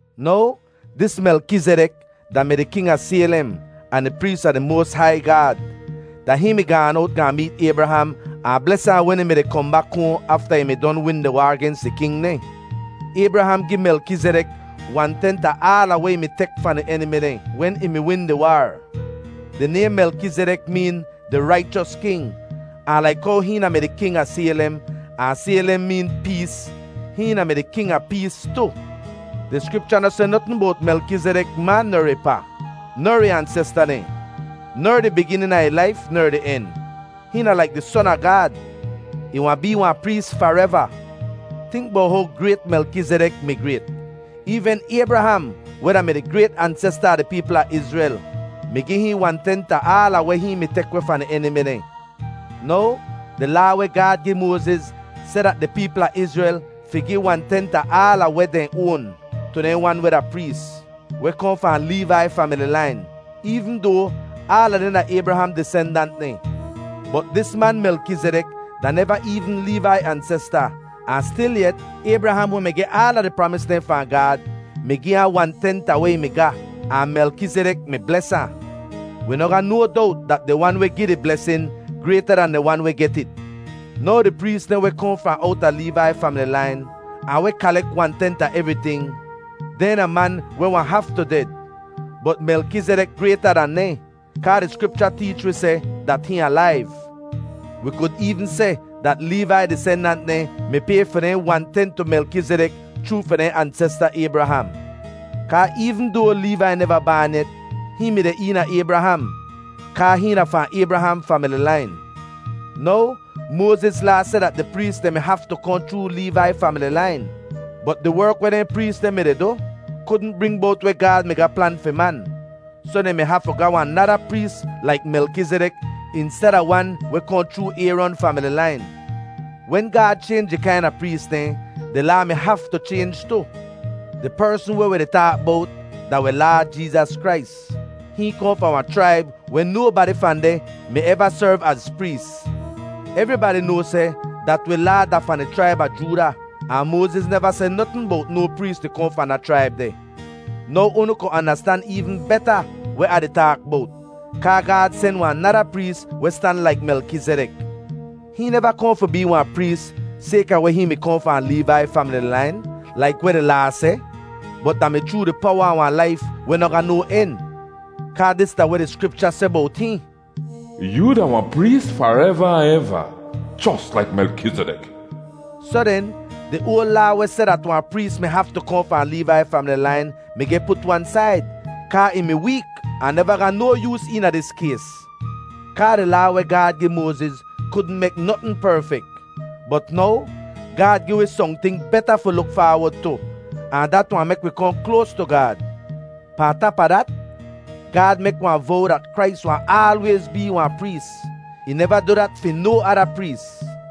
Now, dis Melkizidek da-mi di king a Saylem ahn di prees a di moas hai Gaad. Da hihn mi gaan owt gaahn meet Aybraham ahn bles ahn wen ih mi-di kohn bak hoahn afta ih mi don win di waar gens di king dehn. Aybraham gi Melkizidek wan-tent a aala weh ih mi tek fahn di enimi dehn wen ih mi win di waar. Di naym Melkizidek meen “Di Raichos King.” Ahn laik how hihn da-mi di king a Saylem ahn Saylem meen “pees,” hihn da-mi di “King a Pees” tu. Di Skripcha noh seh notn bowt Melkizidek ma ner ih pa, ner ih ansesta dehn, ner di biginin a ih laif ner di en. Hihn da laik di Son a Gaad; ih wahn bee wahn prees fareva. Tink bowt how grayt Melkizidek mi grayt! Eevn Aybraham, weh da-mi di grayt ansesta a di peepl a Izrel, mi gi hihn wan-tent a aala weh hihn mi tek weh fahn di enimi dehn. Now, di Laa weh Gaad gi Moaziz seh dat di peepl a Izrel fi gi wan-tent a aala weh dehn oan tu dehn wan weh da prees, weh kohn fahn Leevai famili lain, eevn doa aala dehn da Aybraham disendant dehn. Bot dis man Melkizidek da neva eevn Leevai ansesta, ahn stilyet Aybraham, weh mi geh aala di pramis dehn fahn Gaad, mi gi ahn wan-tent a weh ih mi ga, ahn Melkizidek mi bles ahn. Wi noh ga no dowt dat di wan weh gi di blesin, grayta dan di wan weh get it. Now di prees dehn weh kohn fahn owta Leevai famili lain ahn weh kalek wan-tent a evriting, dehn da man weh wahn haftu ded. Bot Melkizidek grayta dan dehn, kaa di Skripcha teech wi seh dat hihn alaiv. Wi kud eevn seh dat Leevai disendant dehn mi pay fi dehn wan-tent tu Melkizidek chroo fi dehn ansesta Aybraham. Kaa eevn doa Leevai neva baan yet, hihn mi deh eena Aybraham kaa hihn da fahn Aybraham famili lain. Now, Moaziz Laa seh dat di prees dehn mi haftu kohn chroo Leevai famili lain, bot di werk weh dehn prees deh mi-di du, kudn bring bowt weh Gaad mi ga plan fi man. Soh dehn mi haftu ga wahn nada prees laik Melkizidek insteda wan weh kohn chroo Ayron famili lain. Wen Gaad chaynj di kaina prees dehn, di Laa mi haftu chaynj tu. Di persn weh wi di taak bowt da wi Laad Jeezas Krais. Hihn kohn fahn wahn chraib weh nobadi fahn deh mi eva serv az prees. Evribadi noa seh dat wi Laad da fahn di chraib a Jooda, ahn Moaziz neva seh notn bowt no prees di kohn fahn da chraib deh. Now unu ku andastan eevn beta weh Ah di taak bowt. Kaa Gaad sen wahn nada prees weh stan laik Melkizidek. Hihn neva kohn fi bee wahn prees sayka weh hihn mi kohn fahn Leevai famili lain laik weh di Laa seh, bot da mi chroo di powa a wahn laif weh noh ga no en. Kaa dis da weh di Skripcha seh bowt hihn: “Yoo da wahn prees fareva ahn eva, jos laik Melkizidek.” Soh den, di oal Laa weh seh dat wahn prees mi haftu kohn fahn Leevai famili lain mi geh put wan said, kaa ih mi week ahn neva ga no yoos eena dis kays, kaa di Laa weh Gaad gi Moaziz kudn mek notn perfek. Bot now, Gaad gi wi sohnting beta fi luk faawod tu, ahn dat wahn mek wi kohn kloas tu Gaad. Pahn tap a dat, Gaad mek wahn vow dat Krais wahn aalwayz bee wahn prees. Ih neva du dat fi no ada prees.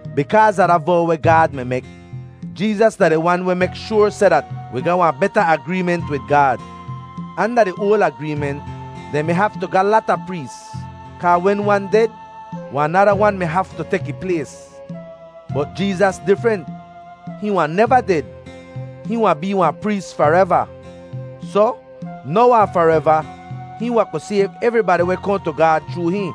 Bikaaz a da vow weh Gaad mi mek, Jeezas da di Wan weh mek shoar seh dat wi ga wahn beta agreement wid Gaad. Anda di oal agreement, dehn mi haftu ga lata prees, kaa wen wan ded, wahn nada wan mi haftu tek ih plays. Bot Jeezas difrent; hihn wahn neva ded. Hihn wahn bee wahn prees fareva! Soh, now ahn fareva, hihn wahn ku sayv evribadi weh kohn tu Gaad chroo hihn,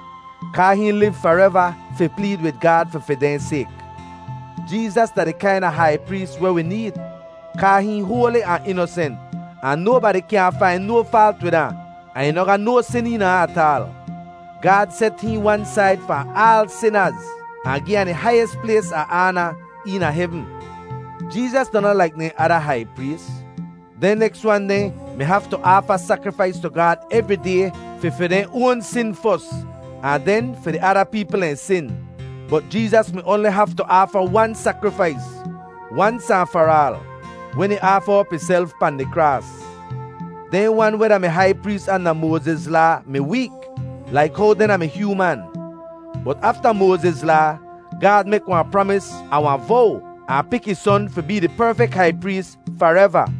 kaa hihn liv fareva fi pleed wid Gaad fi fi dehn sayk. Jeezas da di kaina hai prees weh wi need, kaa hihn hoali ahn inosent, ahn nobadi kyaahn fain no faalt wid ahn, ahn ih noh ga no sin eena ahn ataal. Gaad set hihn wan said fahn aal sinaz, ahn gi ahn di haiyis plays a aana eena hevn. Jeezas da noh laik dehn ada hai prees. Dehn neks wan dehn mi haftu aafa sakrifais tu Gaad evri day fi fi dehn oan sin fos, ahn den fi di ada peepl dehn sin. Bot Jeezas mi oanli haftu aafa wan sakrifais, wans ahn far aal, wen ih aafa op ihself pahn di kraas. Dehn wan weh da-mi hai prees anda Moaziz Laa mi week laik how dehn da-mi hyooman. Bot afta Moaziz Laa, Gaad mek wahn pramis ahn wahn vow, ahn pik ih Son fi bee di perfek hai prees fareva.